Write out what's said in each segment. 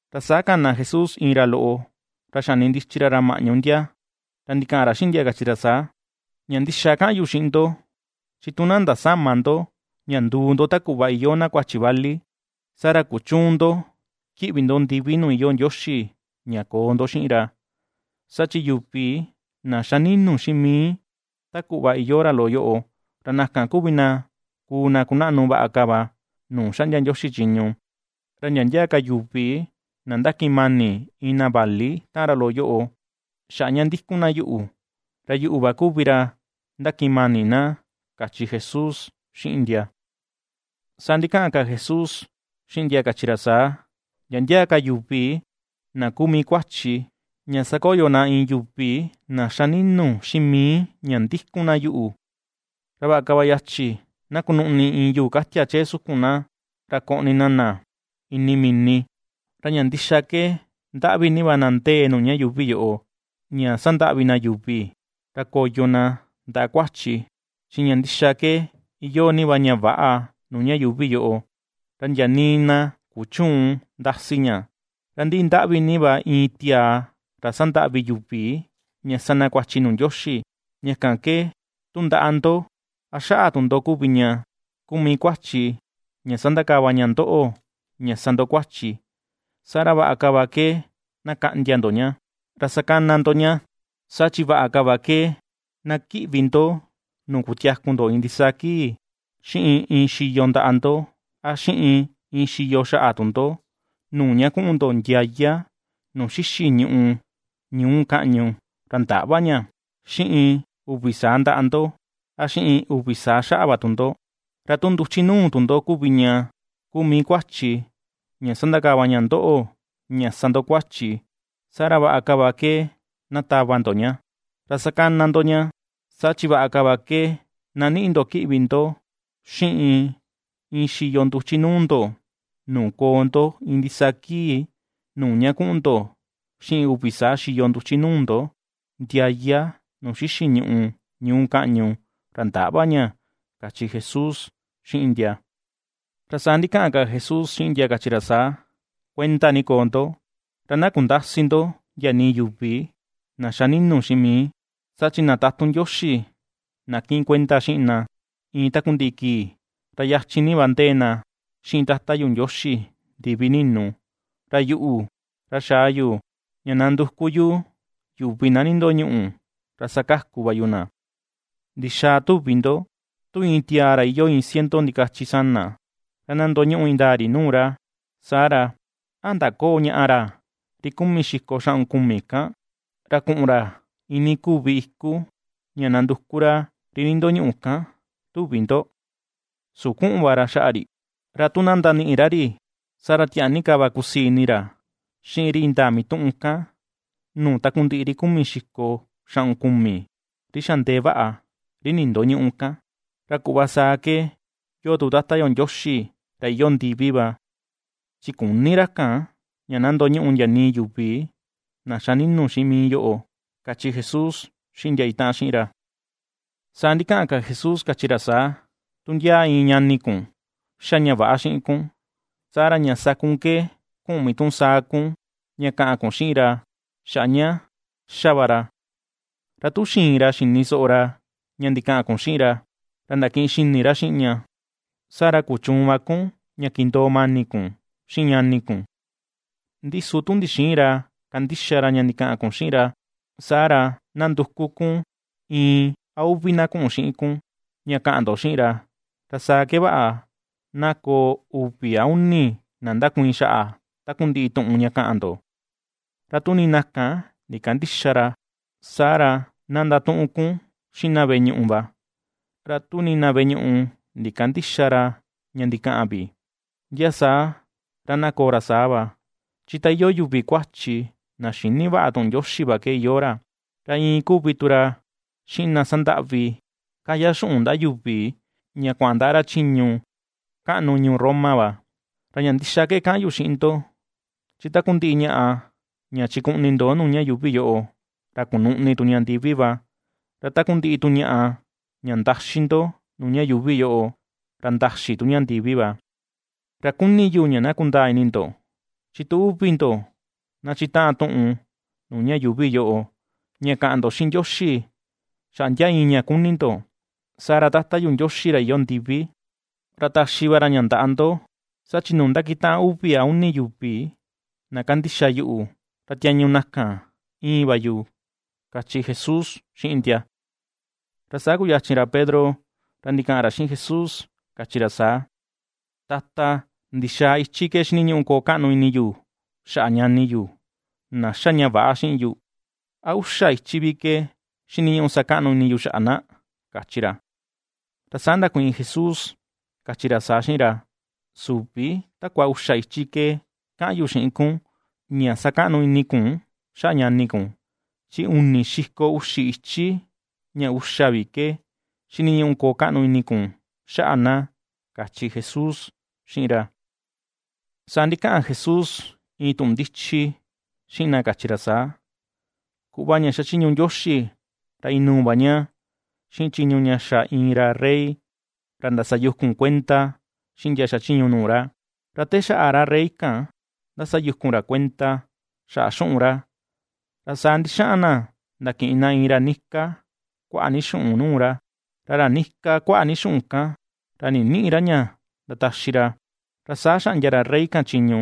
Ra saa kana Jesús iin ra loꞌo, ra xanindichi ra ra maꞌñu ndia. Ra ndikaꞌan ra xiꞌin ndia kachi ra saa: ―Ña ndixa kaꞌan yu xiꞌin ndo, chi tu na ^ndasäma ndo ña nduu ndo ta kuꞌva iyoo na kuachi vali, saa ra kuchüun ndo kiꞌvi ndo ndivi nuu iyoo Ndioxi ña koo ndo xiꞌin ra. Saa chi yuvi na xa ni̱nu̱ xiꞌin mii ta kuꞌva iyoo ra loꞌo yoꞌo, ra na kan kuvi na kuu na kunaꞌnu vaꞌa ka va nuu xaꞌndia Ndioxi chiñu. Ra ndia ndia ka yuvi na ndakiꞌin mani iin na vali taꞌan ra loꞌo yoꞌo xaꞌa ña ndikun na yuꞌu, ra yuꞌu va kuvi ra ndakiꞌin mani na ―kachi Jesús xiꞌin ndia. Saa ndikaꞌan ka Jesús xiꞌin ndia kachi ra saa: ―Ndia ndia ka yuvi na kuu mii kuachi, ña sakoyo na iin yuvi na xa ninu xiꞌin mii ña ndikun na yuꞌu, ra vaꞌa ka va ke yachi na kunuꞌni iin yuu katia chee sukun na, ra koꞌni na na ini mini. Ra ña ndixa ke ndaꞌvi ni va na ndee nuu ña yuuvi yoꞌo, ña sandaꞌvi na yuvi, ra koyo na ndaꞌa kuachi, chi ña ndixa ke iyoo ni va ña väꞌa nuu ña yuuvi yoꞌo, ra ndia nii na kuchuun ndasi ña, ra ndi ndaꞌvi ni va iin tiaa ra sandaꞌvi yuvi ña sa na kuachi nuu Ndioxi. Ña kan ke, tu ndaꞌa ndo, a xaꞌa tu ndo kuvi ña kuu mii kuachi ña sandakava ña ndoꞌo ña sa ndo kuachi, saa ra vaꞌa ka va ke na kaꞌndia ndo ña, ra sakana ndo ña, saa chi vaꞌa ka va ke na kiꞌvi ndo nuu kutiaku ndo iin ndisaa kii, xiꞌin iin xiyo ndaꞌa ndo, a xiꞌin iin xiyo xaꞌa tu ndo nuu ña kuꞌun ndo ndiaya nuu xixi ñùꞌù ñuu kaꞌñu, ra ndäꞌva ña, xiꞌin uvi saa ndaꞌa ndo, a xiꞌin uvi saa xaꞌa va tu ndo. Ra tu nduchi nuu tu ndo kuvi ña kuu mii kuachi ña sandakava ña ndoꞌo sa ndo kuachi, saa ra vaꞌa ka va ke na tava ndo ña, ra sakana ndo ña, saa chi vaꞌa ka va ke na niꞌi ndo kiꞌvi ndo xiꞌin iin xiyo nduchi nuu ndo nuu koo ndo iin ndisaa kii, nuu ña kuꞌun ndo xiꞌin uvi saa xiyo nduchi nuu ndo ndiaya nuu xixi ñùꞌù ñuu kaꞌñu, ra ndäꞌva ña ―kachi Jesús xiꞌin ndia. Ra saa ndikaꞌan ka Jesús xiꞌin ndia kachi ra saa: ―Kuenda ni koo ndo, ra na kundäsi ndo ndia nii yuvi na xa ninu xiꞌin mii, saa chi na tatun Ndioxi na kiꞌin kuenda xiꞌin na iin takundiꞌi kii, ra yachin ni va ndee na xiꞌin Tata yu Ndioxi ndivi ninu. Ra yuꞌu, ra xaa yoꞌo vichin, ra xaa yu ña nanduku yu yuvi na nindoñuꞌu, ra sakaku va yu na. ’¿Ndixaa tuvi ndo? Tu iin tiaa ra iyoo iin ciento ndikachi sana ra, ra na ndoñuꞌu indaa ri nuu ra, saa ra, ¿a ndaköo ñaꞌa ra ri kumi xiko xaꞌun kumi kan, ra kuꞌun ra iinii kuvi iku ña nanduku ra ri nindoñuꞌu kan, tuvi ndo? ¿Su kuꞌun va ra xaꞌa ri? Ra tu na ndaniꞌi ra ri, saa ra tiaa ni ka va kusii ini ra xiꞌin ri indaa mituꞌun kan, nuu takundiꞌi ri kumi xiko xaꞌun kumi, ri xa ndee vaꞌa, ri nindoñüꞌu kan. Ra kuꞌva saa ke yoo tu Tata yo Ndioxi ra iyoo ndivi va, chi küni ra kan ña na ndoñuꞌu ndia nii yuvi na xa ninu xiꞌin mii yoꞌo ―kachi Jesús xiꞌin ndia itaꞌan xiꞌin ra. Saa ndikaꞌan ka Jesús kachi ra saa: ―Tu ndia iin ñani kun ^xa ña väꞌa xiꞌin kun, saa ra ña sa kun ke kuꞌun mituꞌun saa kun, ña kaꞌan kun xiꞌin ra xaꞌa ña ^xa va ra; ra tu xiin ra xini soꞌo ra ña ndikaꞌan kun xiꞌin ra, ra ndakiꞌin xini ra xiꞌin ña, saa ra kuchuun va kun ña ^kindoo mani kun xiꞌin ñani kun. Ndi su tu ndixïin ra kandixa ra ña ndikaꞌan kun xiꞌin ra, saa ra na nduku kun, iin a uvi na kuꞌun xiꞌin kun, ña kaꞌan ndo xiꞌin ra, ra saa ke vaꞌa na koo uvi a uni na ndakuiin xaꞌa takundiꞌi tuꞌun ña kaꞌan ndo. Ra tu nii na kan ndikandïxa ra, saa ra na ndatuꞌun kun xiꞌin na veꞌe ñuꞌu va, ra tu nii na veꞌe ñuꞌu ndikandïxa ra ña ndikaꞌan vi, ndia saa ra na koo ra saa va, chi ta iyoo yuvi kuachi na xïni vaꞌa tuꞌun Ndioxi va ke iyoo ra, ra iin kuvi tu ra xiꞌin na sandaꞌvi, kaya xuꞌun ndaꞌa yuvi ña kuaꞌan ndaꞌa ra chiñu kaꞌnu ñuu Roma va. ’Ra ña ndixa ke kaꞌan yu xiꞌin ndo, chi takundiꞌi ñaꞌa, ña chikuꞌni ndo nuu ña yuuvi yoꞌo, ra kunuꞌni tu ña ndivi va, ra takundiꞌi tu ñaꞌa, ña ndaxi ndo nuu ña yuuvi yoꞌo, ra ndaxi tu ña ndivi va. ’Ra kuni yu ña na kundaa ini ndo, chi tu uvi ndo na chitaꞌan tuꞌun nuu ña yuuvi yoꞌo, ña kaꞌan ndo xiꞌin Ndioxi, xaꞌa ndia iin ña kuni ndo, saa ra Tata yu Ndioxi ra iyoo ndivi, ra taxi va ra ña ndaꞌa ndo. Saa chi nuu ndakitaꞌan uvi a uni yuvi, na kandixa yuꞌu, ra tiañu na kan íin va yu ―kachi Jesús xiꞌin ndia. Ra saa kuyachin ra Pedro ra ndikaꞌan ra xiꞌin Jesús kachi ra saa: ―Tata, ¿ndixaa ichi ke xiniñuꞌu koo kaꞌnu ini yu xaꞌa ñani yu, na ^xa ña väꞌa xiꞌin yu? ¿A uxa ichi vi ke xiniñuꞌu sa kaꞌnu ini yu xaꞌa na? ―kachi ra. Ra saa ndakuiin Jesús kachi ra saa xiꞌin ra: ―Süvi takua uxa ichi ke kaꞌan yu xiꞌin kun ña sakaꞌnu ini kun xaꞌa ñani kun, chi uni xiko uxi ichi ña uxa vi ke xiniñuꞌu koo kaꞌnu ini kun xaꞌa na ―kachi Jesús xiꞌin ra. Saa ndikaꞌan Jesús iin tuꞌun ndichi xiꞌin ndia kachi ra saa: ―Kuꞌva ña xachiñu Ndioxi ra inuu va ña xiꞌin chiñu ña xa iin ra rey, ra ndasayukun kuenda xiꞌin ndia xachiñu nuu ra. Ra te xaꞌa ra rey kan ndasayukun ra kuenda xaꞌa xuꞌun ra, ra saa ndixaꞌan na ndakiꞌin na iin ra nika kuaꞌa ni xuꞌun nuu ra. Ra ra nika kuaꞌa ni xuꞌun kan, ra ninïꞌi ra ña ndataxi ra, ra saa xaꞌndia ra rey kan chiñu,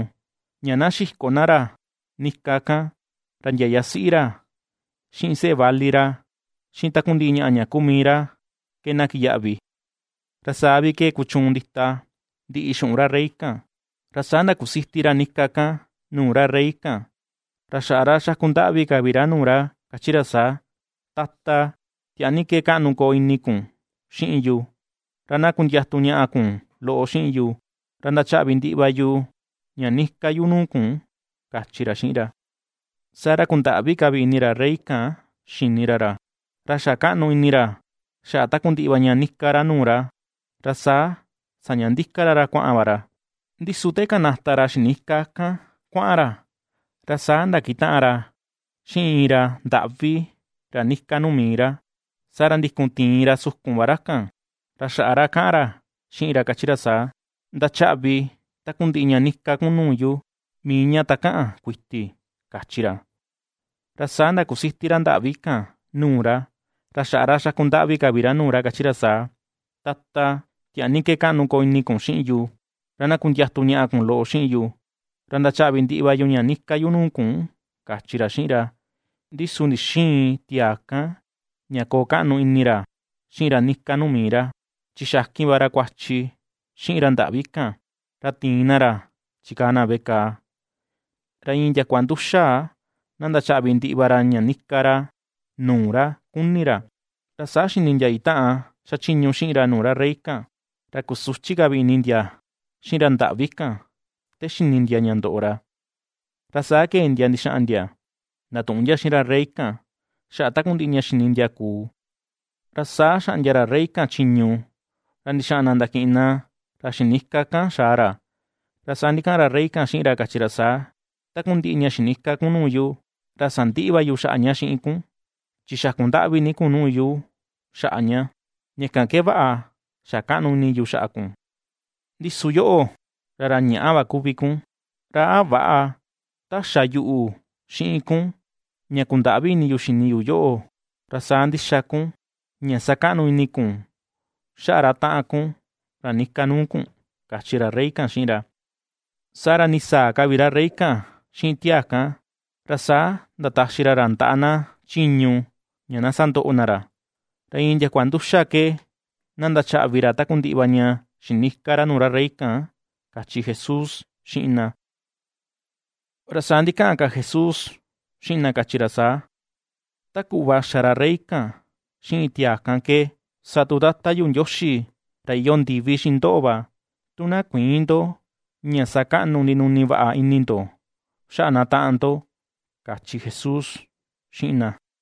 ña na xiko na ra nika kan, ra ndia yasiꞌi ra, xiꞌin seꞌe vali ra, xiꞌin takundiꞌi ñaꞌa ña kuu mii ra ke na kiyaꞌvi, ra saa vi ke kuchuun ndita ndiꞌi xuꞌun ra rey kan. Ra saa ndakusiti ra nika kan nuu ra rey kan, ra xaꞌa ra xaku ndaꞌvi ka vi ra nuu ra kachi ra saa: “Tata, tiaa ni ke kaꞌnu na koo ini kun xiꞌin yu, ra na kundiatu ñaꞌa kun loꞌo xiꞌin yu, ra ndachaꞌvi ndiꞌi va yu ña nika yu nuu kun”, kachi ra xiꞌin ra. Saa ra kundaꞌvi ka vi ini ra rey kan xini ra ra, ra xa kaꞌnu ini ra xaꞌa takundiꞌi va ña nika ra nuu ra, ra saa saña ndika ra ra kuaꞌan va ra. Ndi su te kanata ra xinika kan kuaꞌan ra, ra saa ndakitaꞌan ra xiꞌin iin ra ndaꞌvi ra nika nuu mii ra, saa ra ndikun tiin ra sukun va ra kan, ra xaꞌa ra kaꞌan ra xiꞌin ra kachi ra saa: “¡Ndachaꞌvi takundiꞌi ña nika kun nuu yu mii ña takaꞌan kuiti!”, kachi ra. Ra saa ndakusiti ra ndaꞌvi kan nuu ra, ra xaꞌa ra xaku ndaꞌvi ka vi ra nuu ra kachi ra saa: “Tata, tiaa ni ke kaꞌnu na koo ini kun xiꞌin yu, ra na kundiatu ñaꞌa kun loꞌo xiꞌin yu, ra ndachaꞌvi ndiꞌi va yu ña nika yu nuu kun”, kachi ra xiꞌin ra. Ndi su ndixïin tiaa kan ña koo kaꞌnu ini ra xiꞌin ra nika nuu mii ra, chi xakin va ra kuachi xiꞌin ra ndaꞌvi kan, ra tiin na ra chikaa na veꞌe kàà, ra iin ndiakua nduxa na ndachaꞌvi ndiꞌi va ra ña nika ra nuu ra ^kuni ra. Ra saa xini ndia itaꞌan xachiñu xiꞌin ra nuu ra rey kan, ra kusuchi ka vi ini ndia xiꞌin ra ndaꞌvi kan te xini ndia ña ndoꞌo ra, ra saa kee ndia ndixaꞌan ndia ndatuꞌun ndia xiꞌin ra rey kan xaꞌa takundiꞌi ña xini ndia kuu. Ra saa xaꞌndia ra rey kan chiñu, ra ndixaꞌan na ndakiꞌin na ra xinika kan xaa ra, ra saa ndikaꞌan ra rey kan xiꞌin ra kachi ra saa: “Takundiꞌi ña xinika kun nuu yu, ra sandiꞌi va yu xaꞌa ña xiꞌin kun, chi xaku ndaꞌvi ni kun nuu yu xaꞌa ña, ña kan ke vaꞌa xa kaꞌnu ini yu xaꞌa kun, ndi su yoꞌo, ra ra ñaꞌa va kuvi kun. ¿Ra a väꞌa ta xa yuꞌu xiꞌin kun ña kundaꞌvi ini yu xini yu yoꞌo, ra saa ndixa kun ña sa kaꞌnu ini kun xaꞌa ra taꞌan kun ra nika nuu kun?”, kachi ra rey kan xiꞌin ra. Saa ra ndisaa ka vi ra rey kan xiꞌin tiaa kan, ra saa ndataxi ra ra ndaꞌa na chiñu ña na sandoꞌo na ra, ra iin ndiakua nduxa ke na ndachaꞌvi ra takundiꞌi va ña xinika ra nuu ra rey kan ―kachi Jesús xiꞌin ndia. Ra saa ndikaꞌan ka Jesús xiꞌin ndia kachi ra saa: ―Ta kuꞌva xa ra rey kan xiꞌin tiaa kan ke, sa tu Tata yu Ndioxi ra iyoo ndivi xiꞌin ndoꞌo va, tu na kuïin ndo ña sa kaꞌnu ndinuni vaꞌa ini ndo xaꞌa na taꞌan ndo ―kachi Jesús xiꞌin ndia.